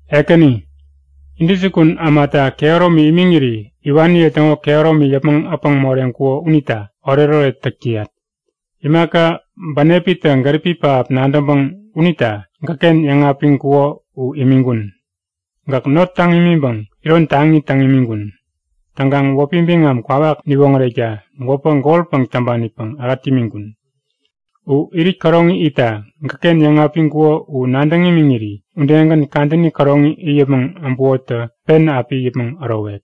Ekäni, intäjukun ämata kehäromi imiŋiri iwaniye täŋo kehäromi yäpmäŋ äpäŋ moreŋkuko unita oretoret täk täyak. Imaka bänepitä gäripi pähap nadäŋpäŋ unita gäkken yäŋapiŋkuko u imiŋkun. Gäk not täŋ imiŋpäŋ iron taŋi täŋ imiŋkun. Täŋkaŋ wäpi biŋam kwawak niwoŋärekta gwäpä golpäŋ täŋpanipäŋ ähät imiŋkun. U irit käroŋi itta gäkken yäŋapiŋkuko u nadäŋ imiŋiri udegän kadäni käroŋi it yäpmäŋ abukotä pen api it yäpmäŋ ärowek.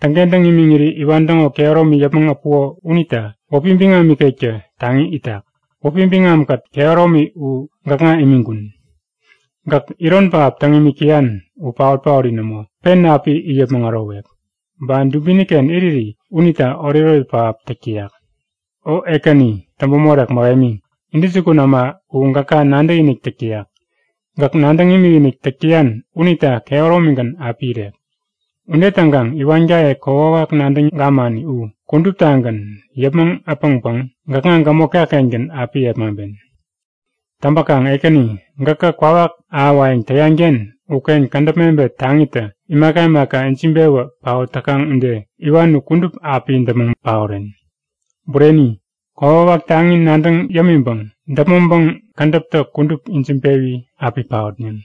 Täŋkentäŋ imiŋiri iwan täŋo kehäromi yäpmäŋ äpuko unita wäpi biŋam ikektä taŋi itak. Wäpi biŋamkät kehäromi u gäkŋa imiŋkun. Gäk iron pähap täŋ imik täyan u paot-paori nämo, pen api it yäpmäŋ ärowek. Ba dubiniken iriri unita oretoret pähap täk täyak. O Ekäni täŋpämorek mähemi, intäjukun äma u gäka nadäkinik täk täyak. Gäk nadäŋ imikinik täk täyan unita kehäromigän api irek. Ude täŋkaŋ iwankaye kokwawak nadäŋ gamani u kuduptagän yäpmäŋ äpäŋpäŋ gäkŋa gämotka-kengän api yepmaŋpen. Täŋpäkaŋ Ekäni, gäkä kwawak ahäwayäŋ täyanken uken kädäp mebet taŋitä imaka imaka ijiŋpewä paot täkaŋ ude iwan u kudup api däpmäŋ paoren. Bureni, kokwawak taŋi nadäŋ yämiŋpäŋ däpmäŋpäŋ kädäptä kudup ijiŋpewi api paotneŋ.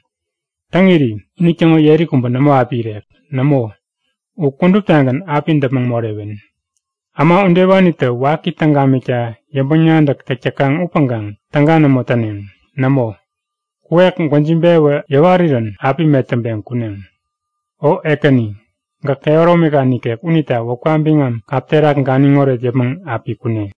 Täŋiri unitäŋo yeri kubä nämo api irek. Nämo, u kuduptagän api däpmäŋ morewen. Äma udewanitä waki täŋ gamikta yäŋpäŋ-nadäk täk täkaŋ upäŋkaŋ täga nämo täneŋ. Nämo, kuwek gwäjiŋpewi yäwarirän api metäŋpeŋ kuneŋ. O Ekäni, gäk kehäromika nikek unita wäpka biŋam kap terak ganiŋoret yäpmäŋ api kune!